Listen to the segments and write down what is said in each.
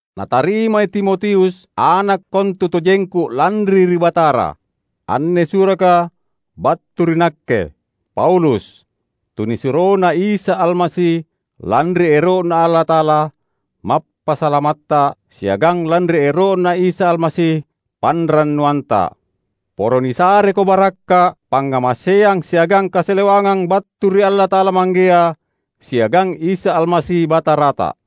Natarimai Timotius, ana’ kontutojengku lanri ri Batara. Anne suraka battu ri nakke, Paulus, tunisuroNa Isa Almasi lanri ero’Na Allata’ala, Mappasalamatta, siagang lanri ero’Na Isa Almasi, panrannuanta. Poro nisareko barakka’, pangngamaseang siagang kasalewangang battu ri Allata’ala Manggea siagang Isa Almasi Batarata.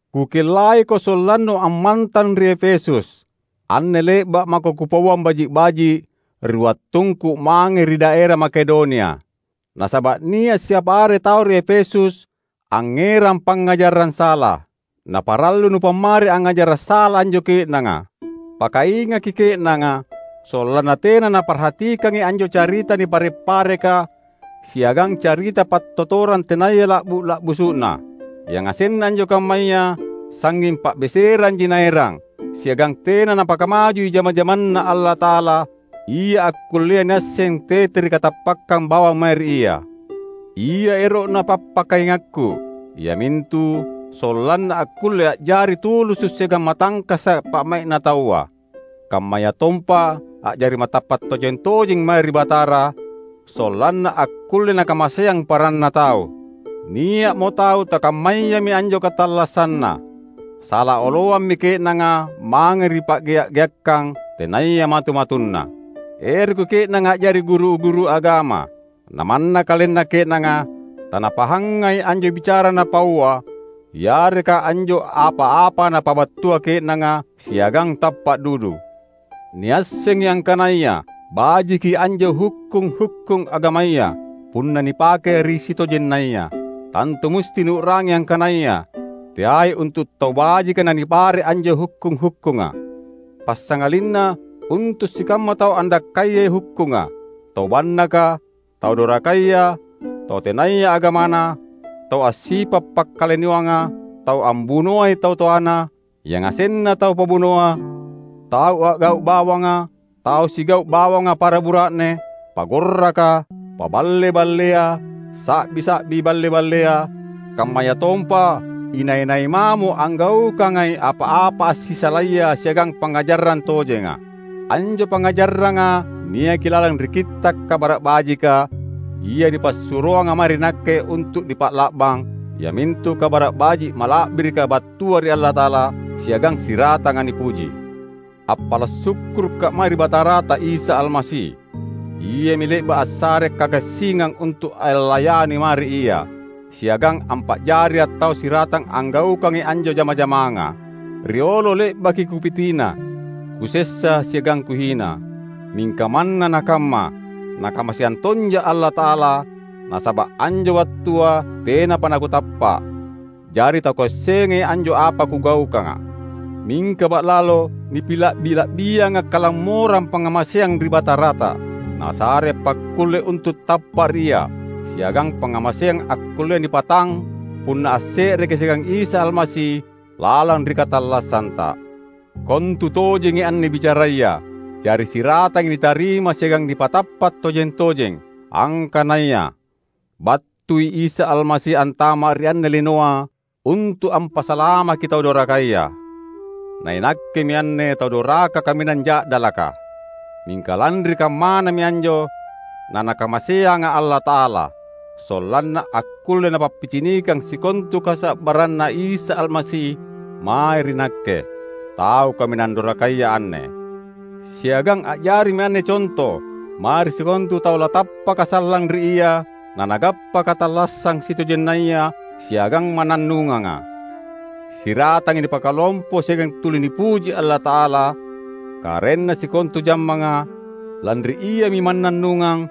Kukellaiko sollannu ammantang ri Efesus. Anne le’ba’ mako kupauang baji’-baji’ ri wattungku mange ri daera Makedonia. Nasaba’ nia’ siapa are tau ri Efesus angngerang pangngajarang sala. Na parallu nupammari angngajara’ sala anjo ke’nanga. Pakaingaki ke’nanga sollanna tena naparhatikangi anjo carita nipare’-pareka siagang carita pattottorang tenaya la’bu’-la’busu’na. Yangasenna anjo kammaya sangnging pa’beseranji naerang, siagang tena napakamajui jama-jamanNa Allata’ala ia akkullea niasseng tete ri katappakkang bawang mae ri Ia. Ia ero’na pappakaingakku, iamintu sollanna akkulle a’jari tulusu’ siagang matangkasa’ pa’mai’na taua, kammayatompa a’jari matappa’ tojeng-tojeng mae ri Batara, sollanna akkulle nakamaseang paranna tau. Nia’mo tau takammayami anjo katallassanna. Sala oloammi ke’nanga mange ri pa’gea’-geakkang tenaya matu-matunna. Eroki ke’nanga a’jari guru-guru agama, namanna kalenna ke’nanga tanapahangai anjo bicara napaua yareka anjo apa-apa napabattua ke’nanga siagang tappa’ dudu. Niassengi angkanaya bajiki anjo hukkung-hukkung agamaya, punna nipake ri sitojennaya. Tantu musti niu’rangi angkanaya teai untu’ tau bajika nanipare’ anjo hukkung-hukkunga, passangalinna untu’ sikamma tau andakkayai hukkunga, tau bannaka, tau dorakaya, tau tenaya agamana, tau assipa’ pakkalinoanga, tau ambunoai tau toana, yangasenna tau pabunoa, tau a’gau’ bawanga, tau sigau’ bawanga para bura’ne, pagorraka, paballe-ballea; sa’bi-sa’bi balle-ballea, kammayatompa inai-nai mamo anggaukangai apa-apa assisalaya siagang pangngajarang tojenga. Anjo pangngajaranga niaki lalang ri Kitta’ Kabara’ Bajika ia nipassuroanga mae ri nakke untu’ nipa’la’bang, iamintu Kabara’ Baji’ mala’birika battua ri Allata’ala siagang siratanga nipuji. Appala’ sukkurukka’ mae ri Batarata Isa Almasi. Iami le’ba’ assarea’ kagassingang untu’ allayani mae ri Ia, siagang ampa’jaria’ tau siratang anggaukangi anjo jama-jamanga. Riolo le’baki kupitina, kusessa siagang kuhina. Mingka manna nakamma Nakamaseang tonja’ Allata’ala, nasaba’ anjo wattua tenapa nakutappa’, jari takuassengai anjo apa kugaukanga. Mingka ba’lalo nipila’bi-la’bianga’ kalammorang pangngamaseang ri Batarata. Nasarea’ pakkulle untu’ tappa’ ri Ia, siagang pangngamaseang akkullea nipatang punna asse’reki’ siagang Isa Almasi lalang ri katallassanta. Kontu tojengi anne bicaraya; jari siratangi nitarima siagang nipatappa’ tojeng-tojeng, angkanaya: "Battui Isa Almasi antama’ ri anne linoa untu’ ampasalamaki tau dorakaya." Na inakkemi anne tau doraka kaminang ja’dalaka. Mingka lanri kammanami anjo naNakamaseanga’ Allata’ala, sollanna akkulle Napappicinikang sikontu kasa’barranNa Isa Almasi mae ri nakke, tau kaminang dorakaya anne. Siagang a’jarimi anne conto mae ri sikontu tau latappaka sallang ri Ia nanagappa katallassang sitojennaya siagang mannannunganga. Siratangi nipakalompo siagang tuli nipuji Allata’ala, Karaenna sikontu jammanga, lanri Iami mannannungang,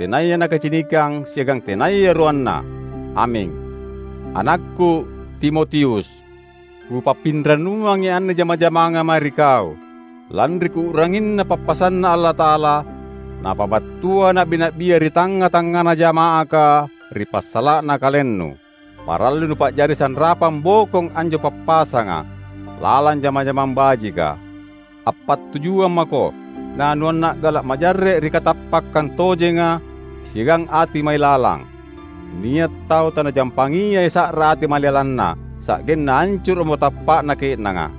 tenaya nakacinikang siagang tenaya ruanna! Aming. Anakku, Timotius! Kupappirannuangi anne jama-jamanga mae ri kau, lanri kuu’ranginna pappasanNa Allata’ala, napabattua na’bi-na’bia ri tangnga-tangngana jama’aka ri passala’na kalennu. Parallui nupa’jari sanrapang bokong anjo pappasanga, lalang jama-jamang bajika. Appattujuang mako na nuanna’gala’ majarre’ ri katappakkang tojenga siagang ati mailalang. Nia’ tau tanajampangiai sa’ra ati mailalanna, sa’genna ancuru’mo tappa’na ke’nanga.